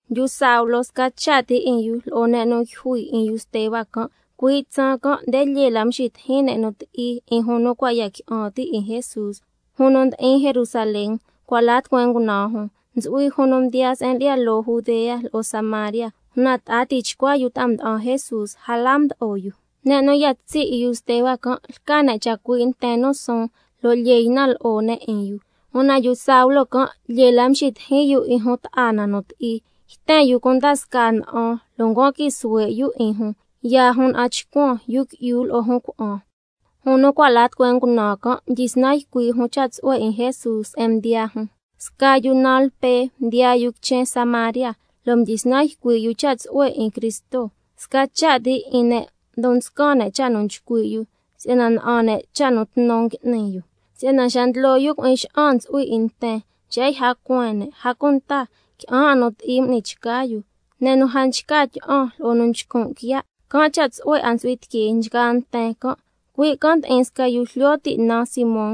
Yu Saulo, sca cha' ti 'in yu lo'o ne' nu yjui 'in yu Steba can'. Cuii' tsaan can' nde lyee la mxitijin ne' nu ti'i 'in jun nu cua' ya qui'an ti' 'in Jesús, jun nu ndi'in Jerusalén, cua' la tucueen ngunaan jun. Ntsu'hui jun nu mdiyaa se'en lyi'ya loo Judea lo'o Samaria, una ta'a tichcua yu ta'a mda'an Jesús, a la mdo'o yu. Ne' nu ya tsi' 'in yu Steba can' lca ne' chacui' nten nu suun, lo' lyee ynan lo'o ne' 'in yu. Una yu Saulo can', lyee la mxitijin yu 'in jun ta'a na nu ti'i, yten yu cunda scaa na'an, lo' ncuan quii suhue' yu 'in jun, yaa jun na'an chcuan, yu qui'yu lo'o jun cuna'an. Jun nu cua' la tucueen ngunaan can', mdyisnan ycui' jun cha' tsu'hue 'in Jesús se'en mdiyaa jun. Sca yu naan Lpe mdiyaa yu quichen Samaria, lo' mdyisnan ycui' yu cha' tsu'hue 'in Cristo. Sca cha' ti 'in ne' ndon nscan ne' cha' nu nchcui' yu, si'yana na'an ne' cha' nu tnu ngui'ni yu, si'yana xa ndlo yu cui'in xa'an ntsu'hui 'in nten, nxi'ya yja cueen ne', a cunta qui'an 'a nu ti'i m'ni chca yu, ne' nu a nchca tyi'an lo'o nu nchcun' quiya', can' cha' tsu'hue 'a ntsu'hui tiquee nchgaa nten can'. Cui' can' ndi'in sca yu jlyo ti' naan Simón,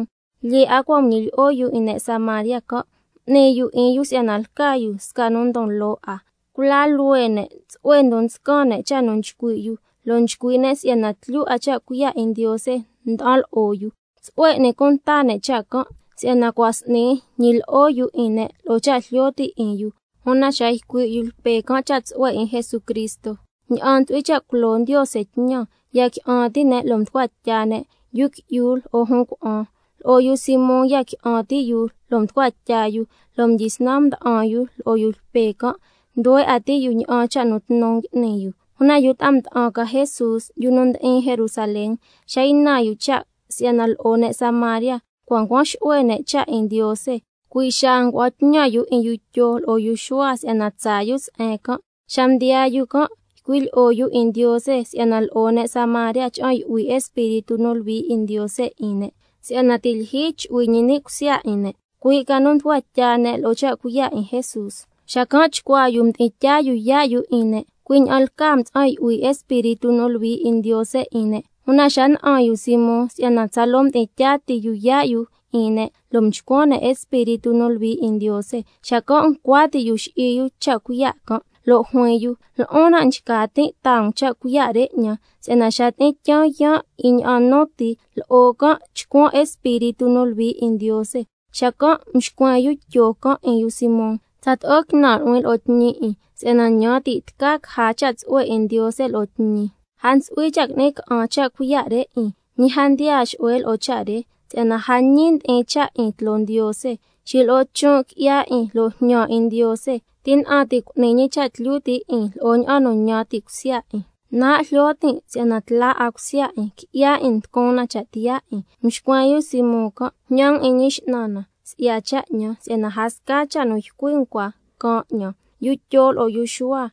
lyee 'a cua' nguñilyi'o yu 'in ne' Samaria can', m'ni yu 'in yu si'yana lca yu sca nu ndon loo 'a. Cula luhue ne' tsu'hue ndon nscan ne' cha' nu nchcui' yu, lo' nchcui' ne' si'yana tlyu 'a cha' cuiya' 'in Ndiose nda'an lo'o yu. Tsu'hue n'ni cunta ne' cha' can', si'yana cua' s'ni ñilyi'o yu 'in ne' lo'o cha' jlyo ti' 'in yu. Una xa ycui' yu Lpe can' cha' tsu'hue 'in Jesucristo ña'an ntsu'hui cha' culo Ndiose tñan, ya qui'an ti' ne' lo' mducua tya ne', yu qui'yu lo'o jun cuna'an. Lo'o yu Simón ya qui'an ti' yu lo' mducua tya yu, lo' mdyisnan mda'an yu lo'o yu Lpe can', nduhue 'a ti' yu ña'an cha' nu tnu ngui'ni yu. Una yu ta'a mda'an ca Jesús, yu nu ndi'in Jerusalén, xa ynan yu cha' si'yana lo'o ne' Samaria cua' ncuan xu'hue ne' cha' 'in Ndiose, cui' xaa ngua'an tñan yu 'in yu Tyo lo'o yu Xuhua si'yana tsaa yu se'en can'. Xa mdiyaa yu can' ycui' lyi'o yu 'in Ndiose, si'yana lo'o ne' Samaria cha'an yu'hui Espíritu nu Luhui 'in Ndiose 'in ne', si'yana ti' lyijyi chu'hui ñi ni' cusya 'in ne', cui' ca nu mducua tya ne' lo'o cha' cuiya' 'in Jesús. Xacan' chcuaa yu mdi'in tyaa yu yaa' yu 'in ne', cui' ña'an lcaa mtsa'an yu'hui Espíritu nu Luhui 'in Ndiose 'in ne'. Una xa na'an yu Simón si'yana tsaloo ndi'in tyaa ti yu yaa' yu 'in ne' lo' nchcuan ne' Espíritu nu Luhui 'in Ndiose, xacan' ncua ti' yu xi'i yu cha' cuiya' can', lo' juin yu: Lo'on nan' nchca tin' taa um cha' cuiya' re 'ñan, si'yana xa tyi'in tyaan yaan' 'in ña'an nu ti, lo'o can' chcuan Espíritu nu Luhui 'in Ndiose. Xacan' mxcuen yu Tyo can' 'in yu Simón: Tsato'o quinan' nu'huin lo'o tñi 'in, si'yana ñan ti' tca caja cha' tsu'hue 'in Ndiose lo'o tñi. A ntsu'hui cha' qui'ni ca'an cha' cuiya' re 'in, ñi a mdiyaa xu'hue lo'o cha' re, si'yana a ñi ndi'in cha' 'in tloo Ndiose. Xilo'o chon' qui'ya 'in lo' jñan 'in Ndiose, tina'an ti' cu'ni ñi cha' tlyu ti' 'in lo'o ña'an nu ñan ti' cusya 'in. Nan' jlyo tin' si'yana tla 'a cusya 'in, qui'ya 'in mducun na cha' tiyaa 'in. Mxcuen yu 'in Simón can': Jñan um 'in Ñi X'nan na si'ya cha' 'ñan, si'yana a sca cha' nu ycui' um cua caan 'ñan. Xa mdyi ycui' yu Tyo lo'o yu Xuhua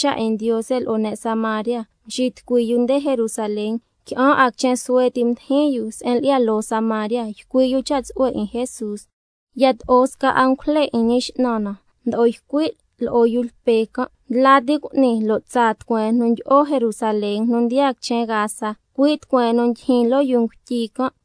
cha' 'in Ndiose lo'o ne' Samaria, mxitucui yu nde Jerusalén. Qui'an 'a quichen suhue ti mdijin yu se'en lyi'ya loo Samaria, ycui' yu cha' tsu'hue 'in Jesús. Yato'o sca angujle 'in Ñi X'nan na mdo'o ycui' lo'o yu Lpe can': Ndla ti cu'ni, lo' tsaa tucueen nu ndyi'o Jerusalén nu ndiyaa quichen Gaza, cui' tucueen nu ndyijyin loo yuu ngutyi can'.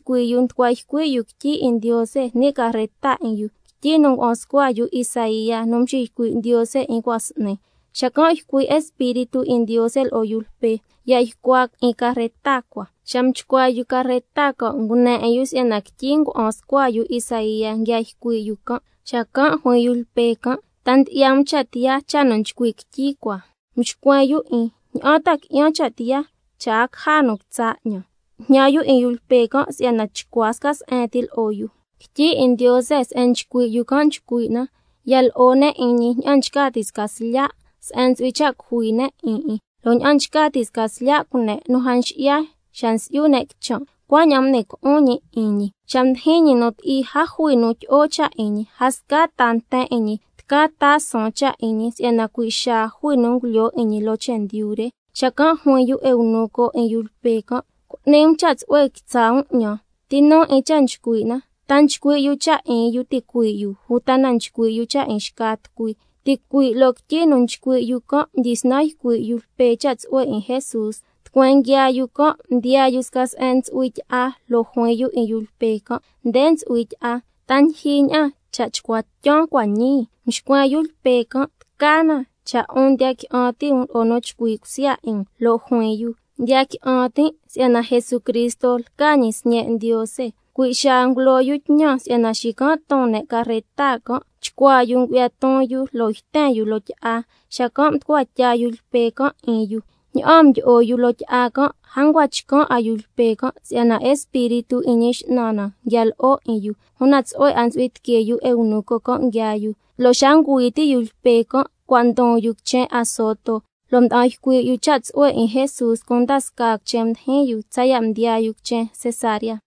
Xa mxitucui yu nducua ycui' yu quityi 'in Ndiose ni' carreta 'in yu, quityi nu ngua'an scua yu Isaía nu mxiycui' Ndiose 'in cua' s'ni. Xacan' ycui' Espíritu 'in Ndiose lo'o yu Lpe: Ya ycua 'in carreta cua. Xa mchcua yu carreta can', ngune 'in yu si'yana quityi ngua'an scua yu Isaía nguia ycui' yu can'. Xacan' juin yu Lpe can': ¿Ta ndyi'ya um cha' tiyaa cha' nu nchcui' quityi cua? Mxcuen yu 'in: ¿Ña'an ta qui'yan cha' tiyaa cha' a caja nu quitsa' 'ñan? Xacan' mjñan yu cha' tsu'hue 'in yu Lpe can' si'yana chcua sca se'en ti lo'o yu. Quityi 'in Ndiose se'en nchcui' yu can' nchcui' na: —Ya lo'o ne' 'in ñi ña'an nchca ti' sca slya' se'en ntsu'hui cha' cujui ne' 'in 'in. Lo' ña'an nchca ti' sca slya' cune' nu a nxi'ya xa nsi'yu ne' quichan', cuaña'an m'ni co'on ñi 'in ñi. Xa mdijin ñi nu ti'i, a jui nu tyi'o cha' 'in ñi. A sca ta nten 'in ñi tca taa suun cha' 'in ñi, si'yana cui' xaa jui nu ngulyoo 'in ñi loo chendyu re—. Xacan' juin yu eunuco 'in yu Lpe can': Cu'ni um cha' tsu'hue quitsa' um 'ñan, ¿ti nu 'in cha' nchcui' na, ta nchcui' yu cha' 'in yu ticuii' yu, uta na nchcui' yu cha' 'in xca tucui? Ticui' loo quityi nu nchcui' yu can' mdyisnan ycui' yu Lpe cha' tsu'hue 'in Jesús. Tucueen nguiaa yu can', mdiyaa yu sca se'en ntsu'hui tyi'a, lo' juin yu 'in yu Lpe can': Nde ntsu'hui tyi'a. ¿Ta ndyijyi ña'an cha' chcua tyan cua' ñii? Mxcuen yu Lpe can': Tca na cha' 'un ndiya qui'an ti' um lo'o nu chcui cusya 'in um. Lo' juin yu: Ndiya qui'an tin' si'yana Jesucristo lca ñi Sñe' Ndiose. Cui' xaa ngulo yu tñan si'yana xican' ton ne' carreta can', chcuaa yu ngu'ya ton yu lo' yten yu loo tyi'a, xacan' mducua tya yu Lpe can' 'in yu. Ña'aan mdyi'o yu loo tyi'a can', a ncua chcan' 'a yu Lpe can' si'yana Espíritu 'in Ñi X'nan na nguia lo'o 'in yu, una tsu'hue 'a ntsu'hui tiquee yu eunuco can' nguiaa yu. Lo' xa ngüi ti' yu Lpe can' cua' ndon yu quichen Azoto, lo' mda'an ycui' yu cha' tsu'hue 'in Jesús cunda scaa quichen mdijin yu tsaya' mdiyaa yu se'en lca Cesarea.